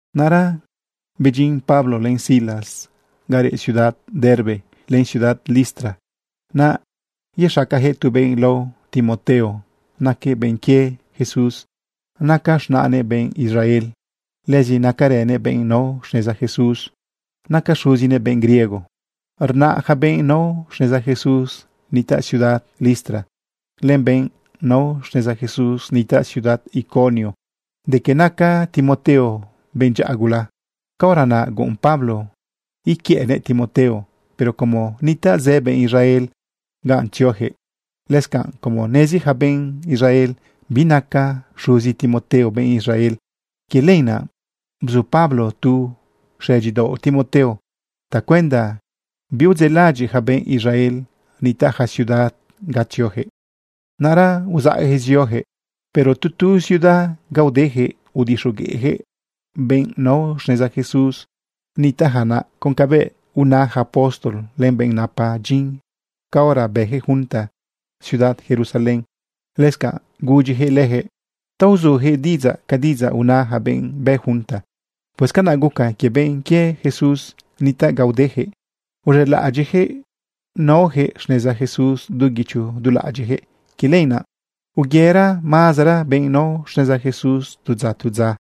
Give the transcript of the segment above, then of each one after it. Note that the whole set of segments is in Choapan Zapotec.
Naꞌra bedyin Pablo len Silas ga reꞌ ciudad Derbe len ciudad Listra. Naꞌ yexacayaquëꞌ tu benꞌ lao Timoteo naquëꞌ benꞌ quie Jesús. Naca z̃naꞌnëꞌ benꞌ Israel, lëzi nacarënëꞌ benꞌ nao xneza Jesús. Naca xuzinëꞌ benꞌ griego. Rna ja benꞌ nao xneza Jesús nitaꞌ ciudad Listra, len benꞌ nao xneza Jesús nitaꞌ ciudad Iconio, de que naca Timoteo benꞌ dyaꞌa gula. Caora naꞌ guꞌun Pablo uquiëꞌnëꞌ Timoteo, pero como nitaꞌ zë benꞌ Israel ganꞌ tzioyaquëꞌ, lëscanꞌ como nezi yaca benꞌ Israel binaca xuzi Timoteo benꞌ Israel, quie lenaꞌ bzu Pablo tu xëdyidaoꞌ Timoteo tacuenda biudzeꞌlaꞌadyiꞌ ja benꞌ Israel nitaꞌ ja ciudad ga tzioyaquëꞌ. Naꞌra uzaꞌyaquëꞌ zioyaquëꞌ. Pero tu tu ciudad ga udeyaquëꞌ udixogueꞌyaquëꞌ benꞌ nao xneza Jesús nitaꞌja naꞌ con cabëꞌ una yaca apóstol len benꞌ napa dyin caora bëjëꞌ junta ciudad Jerusalén. Lëscanꞌ gudyijëꞌ lejëꞌ ta uzujëꞌ diꞌidzaꞌ ca diꞌidzaꞌ una yaca benꞌ bë junta. Pues canaꞌ guca quie benꞌ quie Jesús nitaꞌ ga udejëꞌ, uz̃elaꞌadyiꞌyaquëꞌ naoyaquëꞌ xneza Jesús du guicho du laꞌadyiꞌjëꞌ. Quie lenaꞌ uyera mazera benꞌ nao xneza Jesús tu dza tu dza.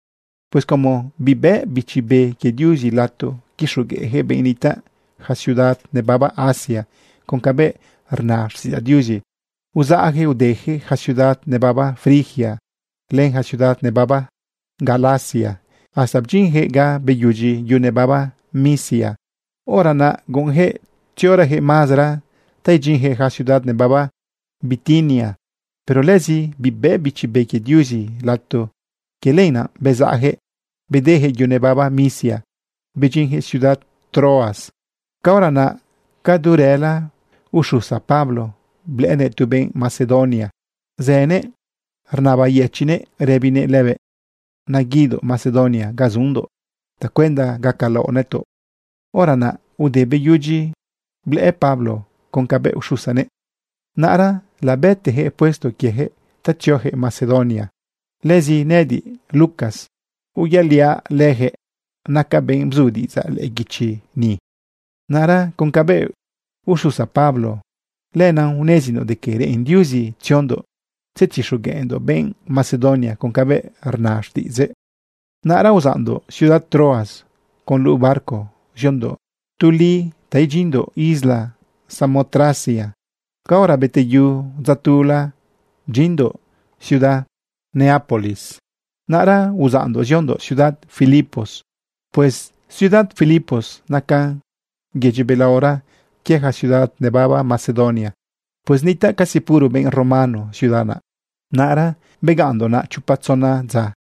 Pues como bibëꞌ Bichi Be quie Diuzi lato quixogueꞌyaquëꞌ benꞌ nitaꞌ yaca ciudad nebaba Asia con cabëꞌ rna xtiꞌidzaꞌ Diuzi, uzaꞌyaquëꞌ udeyaquëꞌ yaca ciudad nebaba Frigia len yaca ciudad nebaba Galacia hasta bdyinyaquëꞌ ga beyudyi yu nebaba Misia. Hora naꞌ guꞌunyaquëꞌ tziorayaquëꞌ mazera ta idyinyaquëꞌ yaca ciudad nebaba Bitinia, pero lëzi bibëꞌ Bichi Be quie Diuzi lato. Quie lenaꞌ bezaꞌyaquëꞌ bedeyaquëꞌ yu nebaba Misia bedyinyaquëꞌ ciudad Troas. Caora naꞌ ca du rëla, uxusa Pablo blëꞌënëꞌ tu benꞌ Macedonia zënëꞌ rnabayëchiꞌnëꞌ rëbinëꞌ lëbëꞌ: “Naguidoꞌ Macedonia ga zundoꞌ tacuenda gacalaoꞌ nëtoꞌ.” Hora naꞌ ude beyudyi blëꞌë Pablo con cabëꞌ uxusanëꞌ, naꞌra labëteyaquëꞌ puesto quieyaquëꞌ ta tzioyaquëꞌ Macedonia. Lëzi nëꞌëdiꞌ, Lucas, uyaliaꞌ leyaquëꞌ. Nacaꞌ benꞌ bzu diꞌidzaꞌ lëꞌë guichi ni. Naꞌra con cabëꞌ uxusa Pablo, lenaꞌ unezindoꞌ de que reꞌen Diuzi tziondoꞌ tzetixogueꞌndoꞌ benꞌ Macedonia con cabëꞌ rna xtiꞌidzëꞌ. Naꞌra uzaꞌndoꞌ ciudad Troas con luꞌu barco ziondoꞌ tu li ta idyinndoꞌ isla Samotracia. Caora beteyu dza tula bdyinndoꞌ ciudad Neápolis. Naꞌra uzaꞌndoꞌ ziondoꞌ ciudad Filipos. Pues ciudad Filipos nacan yedyi belaora quie ja ciudad nebaba Macedonia. Pues nitaꞌ casi puro benꞌ romano ciudad naꞌ. Naꞌra begaꞌnndoꞌ naꞌ chopa tzona dza.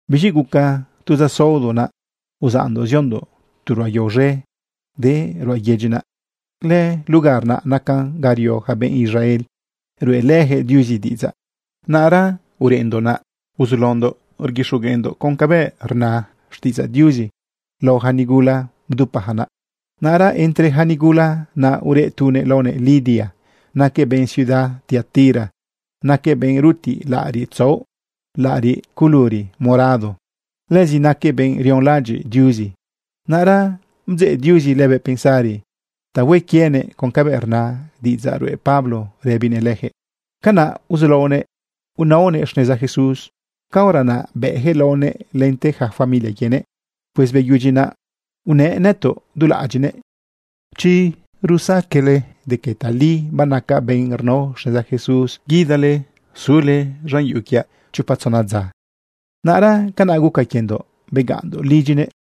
Biz̃i guca tu dza saodo naꞌ uzaꞌndoꞌ ziondoꞌ tu ruꞌa yao z̃e de ruꞌa yedyi naꞌ. Lëlugar naꞌ nacan ga rio ja benꞌ Israel ruꞌelëyaquëꞌ Diuzi diꞌidzaꞌ. Naꞌra ureꞌndoꞌ naꞌ uzulaondoꞌ rguixogueꞌndoꞌ con cabëꞌ rna xtiꞌidzaꞌ Diuzi lao ja nigula bdupayaca naꞌ. Naꞌra entre ja nigula naꞌ ureꞌ tunëꞌ laonëꞌ Lidia. Naquëꞌ benꞌ ciudad Tiatira. Naquëꞌ benꞌ rutiꞌ laꞌariꞌ tzaꞌo, laꞌariꞌ culuri morado. Lëzi naquëꞌ benꞌ rionlaꞌadyiꞌ Diuzi. Naꞌra bdzeꞌ Diuzi lëbëꞌ pensari ta hue quienëꞌ con cabëꞌ rna diꞌidzaꞌ ruꞌe Pablo rëbinëꞌ leyaquëꞌ. Canaꞌ uzulaonëꞌ inaonëꞌ xneza Jesús. Caora naꞌ bëꞌyaquëꞌ laonëꞌ lente yaca familia quienëꞌ. Pues beyudyi naꞌ, unëꞌ nëtoꞌ du laꞌadyiꞌnëꞌ: ―Chi psaqueꞌle de que tali banacaꞌ benꞌ rnao xneza Jesús, guidale sule z̃an yuꞌu quiaꞌ chopa tzona dza. Naꞌra canaꞌ guca quiendoꞌ, begaꞌnndoꞌ lidyinëꞌ.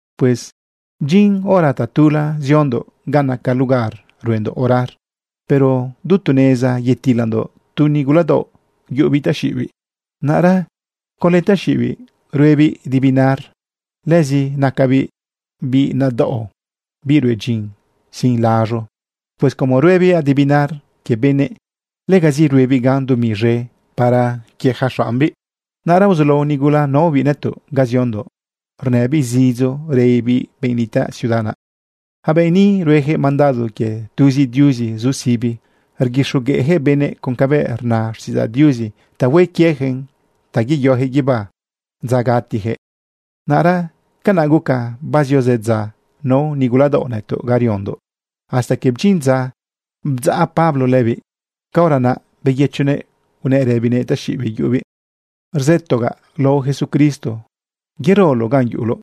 Pues bdyin hora tatula ziondoꞌ ga naca lugar ruendoꞌ orar. Pero du tu neza yetilandoꞌ tu niguladaoꞌ yuꞌubiꞌ taxiꞌibiꞌ. Naꞌra conlë taxiꞌibiꞌ ruebiꞌ divinar. Lëzi nacabiꞌ biꞌ nadaꞌo, biꞌ rue dyin sin laz̃u. Pues como ruebiꞌ divinar quie benëꞌ, legazi ruebiꞌ gan dumi z̃e para quie ja xaꞌmbiꞌ. Naꞌra uzulao nigula naobiꞌ nëtoꞌ ga ziondoꞌ rnëbiꞌ zidzo rëbibiꞌ benꞌ nitaꞌ ciudad naꞌ: ―Yaca benꞌ ni rueyaquëꞌ mandado quie tuzi Diuzi zu sibi. Rguixogueꞌyaquëꞌ benëꞌ con cabëꞌ rna xtiꞌidzaꞌ Diuzi ta hue quieyaquëꞌn ta yeyoyaquëꞌ guibá dza gatiyaquëꞌ. Naꞌra canaꞌ guca bazio zëdza nao niguladaoꞌ nëtoꞌ ga riondoꞌ hasta que bdyin dza bdzaꞌ Pablo lëbiꞌ. Caora naꞌ beyëchonëꞌ unëꞌ rëbinëꞌ taxiꞌibiꞌ yuꞌubiꞌ: ―Rzëtogaꞌ lao Jesucristo, yeroloꞌ ganꞌ yuꞌuloꞌ.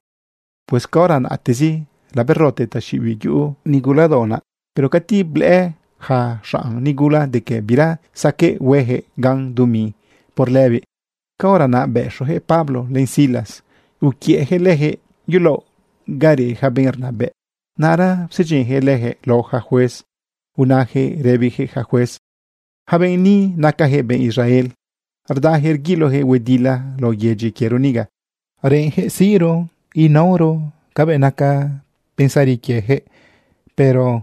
Pues caora naꞌtezi laberote taxiꞌibiꞌ yuꞌu niguladaoꞌ naꞌ. Pero cati blëꞌë yaca xanꞌ nigula de que bira saqueꞌ hueyaquëꞌ gan dumi por lëbiꞌ, caora naꞌ bëxoyaquëꞌ Pablo len Silas, uquiëꞌyaquëꞌ lejëꞌ yulaoꞌ ga reꞌ yaca benꞌ rnabëꞌ. Naꞌra psedyinyaquëꞌ lejëꞌ lao yaca juez unayaquëꞌ rëbiyaquëꞌ ja juez: ―Yaca benꞌ ni nacayaquëꞌ benꞌ Israel. Rdayaquëꞌ rguiloyaquëꞌ huedila lao yedyi quiero niga. Reꞌenyaquëꞌ siꞌro inaoro cabëꞌ naca pensari quiejëꞌ, pero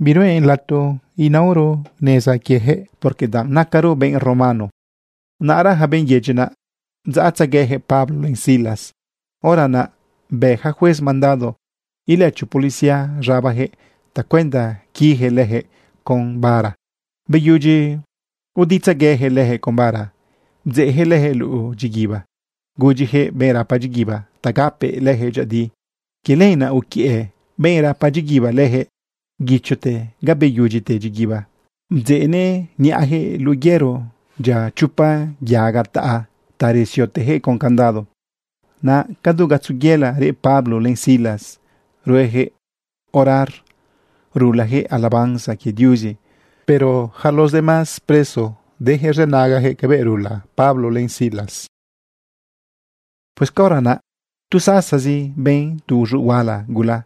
biruꞌen lato inaoro xneza quieyaquëꞌ, porque danꞌ nacaro benꞌ romano. Naꞌra yaca benꞌ yedyi naꞌ, bdzaꞌtzegueyaquëꞌ Pablo len Silas. Hora naꞌ bë ja juez mandado ilëcho policía z̃abajëꞌ tacuenda quiyaquëꞌ lejëꞌ con bara. Beyudyi uditzagueyaquëꞌ lejëꞌ con bara, bdzeꞌyaquëꞌ lejëꞌ luꞌu dyiguiba, gudyiyaquëꞌ benꞌ rapa dyiguiba ta gapëꞌ lejëꞌ dyëꞌëdi. Quie lenaꞌ uquiëꞌ benꞌ rapa dyiguiba lejëꞌ guichote ga beyudyite dyiguiba, bdzeꞌnëꞌ niꞌajëꞌ luꞌu yëro dyia chopa yaga taꞌa ta resiotejëꞌ con candado. Naꞌ cadu gatzo yëla reꞌ Pablo len Silas rueyaquëꞌ orar rulayaquëꞌ alabanza quie Diuzi, pero yaca los demás preso deyaquëꞌ rzënagayaquëꞌ cabëꞌ rula Pablo len Silas. Pues caora naꞌ tu sasazi, ben tu uz̃uꞌ huala gula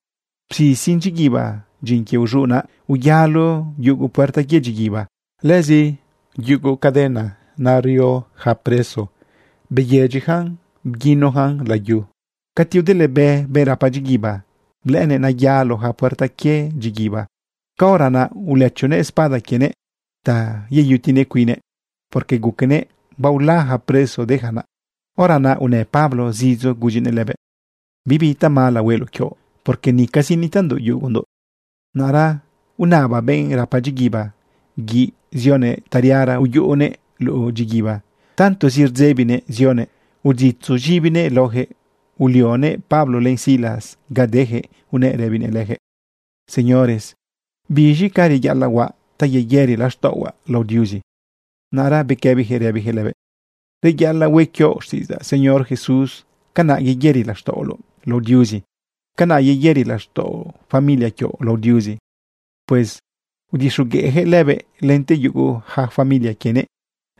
bzisin dyiguiba. Dyin quie uz̃uꞌ naꞌ, uyalo yugu puerta quie dyiguiba. Lëzi yugu caden naꞌ nario ja preso beyedyijan bguinojan layu. Cati udëlebë benꞌ rapa dyiguiba, blëꞌënëꞌ nayalo ja puerta quie dyiguiba. Caora naꞌ ulëchonëꞌ espada quienëꞌ ta yeyutinëꞌ cuinnëꞌ, porque guquenëꞌ baola yaca preso de ja naꞌ. Hora naꞌ unë Pablo zidzo gudyinëꞌ lëbëꞌ: ―Bibi tamala hueloꞌ quioꞌ, porque nicazi nitaꞌndoꞌ yugundoꞌ. Naꞌra unaba benꞌ rapa dyiguiba guiꞌ zionëꞌ tariara uyuꞌunëꞌ luꞌu dyiguiba. Tantozi rdzebinëꞌ zionëꞌ uditzu z̃ibinëꞌ laojëꞌ, ulionëꞌ Pablo len Silas ga dejëꞌ unëꞌ rëbinëꞌ lejëꞌ: ―Señores, ¿biz̃i ca reyaꞌalaꞌ huaꞌ ta yeyëri laxtaꞌohuaꞌ lao Diuzi? Naꞌra bequëbijëꞌ rëbijëꞌ lëbëꞌ: ―Reyaꞌalaꞌ hue quioꞌ xtiꞌidzaꞌ Señor Jesús. Canaꞌ yeyëri laxtaꞌoloꞌ lao Diuzi, canaꞌ yeyëri laxtaꞌo familia quioꞌ lao Diuzi. Pues udixogueꞌjëꞌ lëbëꞌ lente yugu yaca familia quienëꞌ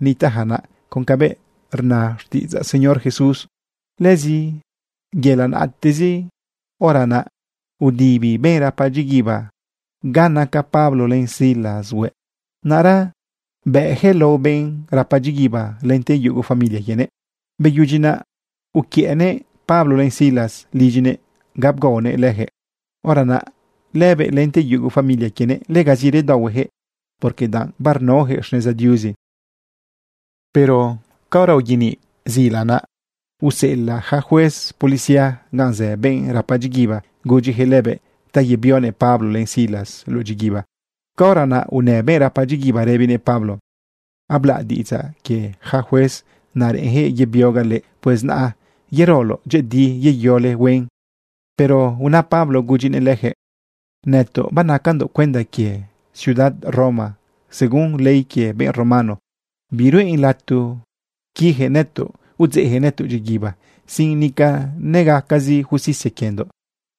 nitaꞌja naꞌ con cabëꞌ rna xtiꞌidzaꞌ Señor Jesús. Lëzi yëla naꞌtezi hora naꞌ, udibi benꞌ rapa dyiguiba ga naca Pablo len Silas hueꞌ. Naꞌra bëꞌyaquëꞌ lao benꞌ rapa dyiguiba lente yugo familia quienëꞌ. Beyudyi naꞌ uquiëꞌnëꞌ Pablo len Silas lidyinëꞌ ga bgaonëꞌ leyaquëꞌ. Hora naꞌ lëbëꞌ lente yugo familia quienëꞌ, legazi redaohueyaquëꞌ, porque danꞌ barnaojëꞌ xneza Diuzi. Pero caora uyeniꞌ zila naꞌ, useꞌelaꞌ yaca juez policía gan zë benꞌ rapa dyiguiba gudyiyaquëꞌ lëbëꞌ ta yebionëꞌ Pablo len Silas luꞌu dyiguiba. Caora naꞌ unë benꞌ rapa dyiguiba rëbinëꞌ Pablo: ―Ablaꞌ diꞌidzaꞌ quie ja juez naꞌ reꞌenyaquëꞌ yebiogaꞌ leꞌe. Pues naꞌ yerole dyëꞌëdi, yeyole huen. Pero una Pablo gudyinëꞌ lejëꞌ: ―Nëtoꞌ banacandoꞌ cuenda quie ciudad Roma. Según ley quie benꞌ romano, biruꞌen lato quiyaquëꞌ nëtoꞌ udzeꞌyaquëꞌ nëtoꞌ dyiguiba sin nica negacazi justicia quiendoꞌ.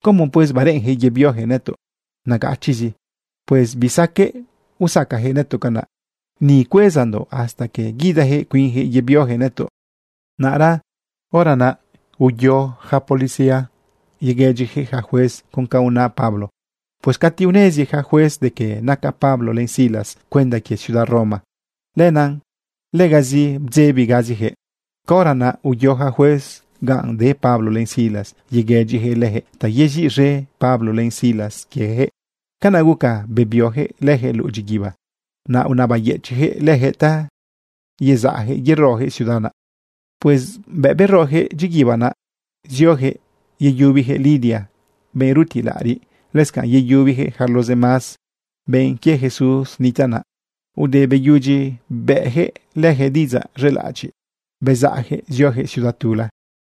¿Cómo pues bareꞌenyaquëꞌ yebioyaquëꞌ nëtoꞌ nagachiꞌzi? ¡Pues bisaqueꞌ usacayaquëꞌ nëtoꞌ canaꞌ! Ni cuezandoꞌ hasta que guidayaquëꞌ cuinyaquëꞌ yebioyaquëꞌ nëtoꞌ. Naꞌra hora naꞌ uyo ja policía yeguëdyiyaquëꞌ yaca juez con ca una Pablo. Pues cati unezi yaca juez de que naca Pablo len Silas cuenda quie ciudad Roma, lenaꞌ legazi bdzebigaziyaquëꞌ. Caora naꞌ uyo yaca juez ganꞌ de Pablo len Silas yeguëdyijëꞌ lejëꞌ ta yeziꞌz̃e Pablo len Silas quieyaquëꞌ. Canaꞌ guca bebioyaquëꞌ lejëꞌ luꞌu dyiguiba. Naꞌ unabayëchiꞌjëꞌ lejëꞌ ta yezaꞌjëꞌ yerojëꞌ ciudad naꞌ. Pues bëꞌ beroyaquëꞌ dyiguiba naꞌ, zioyaquëꞌ yeyubiyaquëꞌ Lidia, benꞌ rutiꞌ laꞌariꞌ. Lëscanꞌ yeyubiyaquëꞌ yaca los demás benꞌ quie Jesús nitaꞌ naꞌ. Ude beyudyi bëꞌyaquëꞌ lejëꞌ diꞌidzaꞌ z̃elaꞌadyiꞌ, bezaꞌyaquëꞌ zioyaquëꞌ ciudad tula.